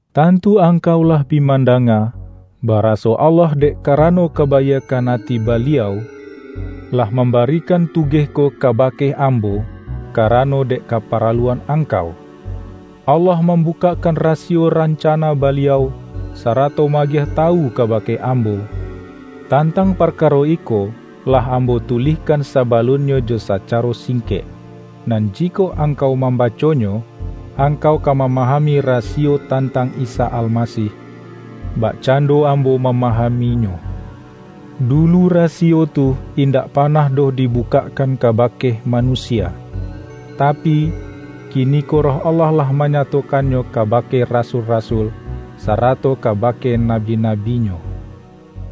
Tantu angkau lah bi mandanga, baraso Allah dek kara-no kabaiakkan ati Baliau, lah mam-barikan tugeh ko kabake ambo, ka-rano dek kaparaluan angkau. Allah mambukakkan rasiyo rancana Baliau, sarato ma-agiah tawu kabake ambo. (Tantang parkaro iko, lah ambo tu-lihkan sabalunnyo jo sacaro singkek, nan jikok angkau mambaconyo, ang-kau ka mamahami rasiyo tantang Isa Almasih, bakcando ambo mamaham-inyo.) Dulu rasiyo tu indak panah doh dibukakkan kabake manusia, ta-pi, kiniko Roh Allah lah manyatokan-nyo kabake rasul-rasul, sarato kaba-ke nabi-nabi-Nyo.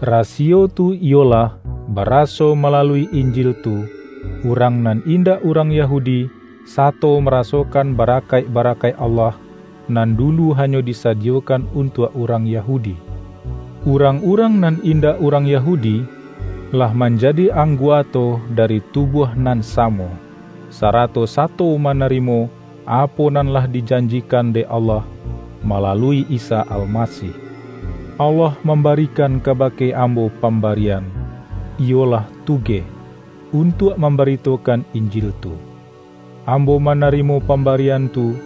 Rasiyo tu iyolah: Baraso malalui Injil tu, urang nan in-dak urang Yahudi, sato marasokan ba-rakaik-barakaik Allah, nan dulu hanyo disadiyokan untuak urang Yahudi. Urang-urang nan indak urang Yahu-di, lah manjadi angguato dari tubuah nan samo, sarato sato manarimo, apo nan lah dijanjikan dek Allah, malalui Isa Almasih. Allah mambarikan kabake ambo pambarian — iyolah tugeh — untuak mambaritokan Injil tu. Ambo mana-rimo pambarian tu,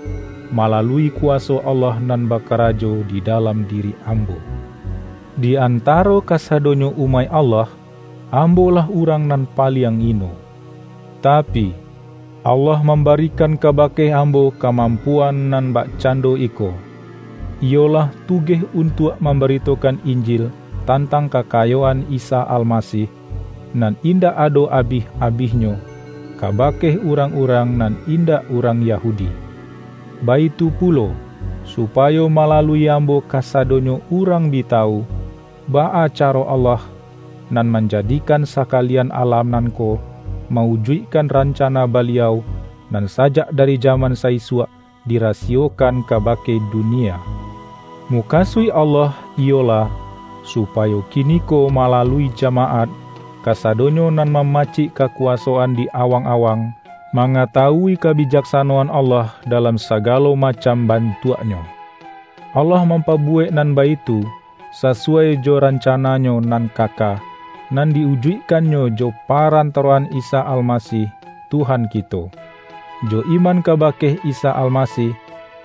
malalui kuwaso Allah nan bakarajo di dalam diri am-bo. Di antaro kasadonyo umaik Allah, ambolah urang nan paliang ino. Ta-pi, Allah mambarikan kabake ambo kamampuan nan bakcando iko: iyo-lah tugeh untuak mambaritokan Injil tantang kakayoan Isa Almasih, nan in-dak ado abih-abihnyo, kabake urang-urang nan indak urang Yahudi; baitu pulo, supayo malalui ambo kasado-nyo urang bi tawu, baa caro Allah, Nan Manjadikan sakalian alam nan ko, ma-ujuikkan rancana Baliau, nan sajak dari jaman sa-isuak dirasiyokan kabake dunia. Mukasuik Allah iyo-lah, supayo kiniko malalui jamaat, ka-sadonyo nan mamacik kakuwasoan di awang-awang, mangatawui kabijaksa-noan Allah dalam sagalo macam ban-tuaknyo. Allah mampabuwek nan baitu, sasuwai jo rancana-Nyo nan kaka, nan di-ujuikkan-Nyo jo paran-taroan Isa Almasih Tuhan kito. Jo iman kabake Isa Almasih,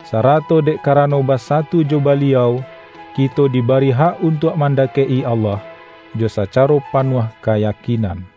sarato dek karano basatu jo Baliau, kito dibari hak untuak mandakek-i Allah, jo sa-caro panuah kayakinan.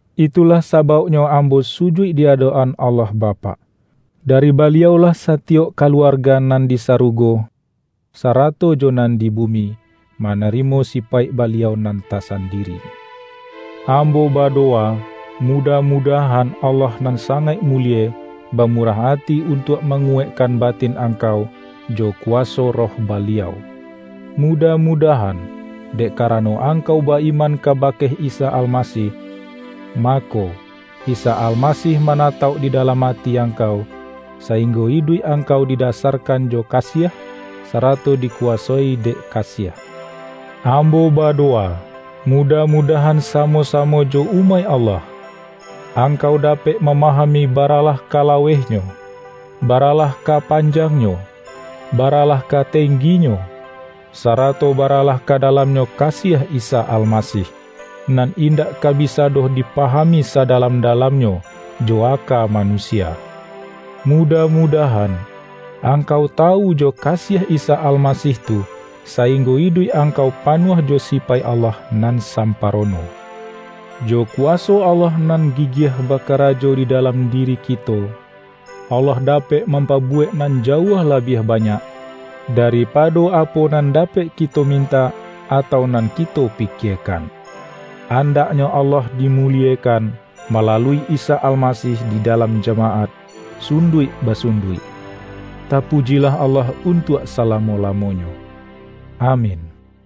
Itulah sabauknyo ambo sujuik di adok-an Allah Bapak. Dari Baliau-lah satiyok kaluarga nan di sarugo, sarato jo nan di bumi, manarimo sipaik Baliau nan tasandiri. Ambo badowa, mudah-mudahan Allah nan sangaik mulie, bamurah ati untuak manguwaikkan batin angkau jo ku-waso Roh Baliau. Mudah-mudah-an, dek karano angkau ba-iman ka-bake Isa Almasih, mako, Isa Almasih manatauk di dalam ati angkau, saing-go iduik angkau didasarkan jo kasiah, sarato dikuwasoi dek kasiah. Ambo badowa, mudah-mudahan samo-samo jo umaik Allah, angkau dapek mama-hami baralah ka lawehnyo, baralah ka panjangnyo, baralah ka tengginyo, sa-rato baralah ka dalamnyo kasiah Isa Almasih, nan indak ka bisa doh di-pahami sadalam-dalamnyo jo aka ma-nusia. Mudah-mudahan angkau ta-wu jo kasiah Isa Almasih tu, sainggo iduik angkau panuah jo sipaik Allah nan samparono. Jo kuwaso Allah nan gigiah ba-karajo di dalam diri kito, Allah da-pek mampabuwek nan jauah labiah banyak, daripado apo nan dapek ki-to mintak, atau nan kito pikiekan. Andaknyo Allah dimuliekan mala-lui Isa Almasih di dalam jamaat sun-duik-basunduik. Tapujilah Allah un-tuak salamo-lamonyo! Amin!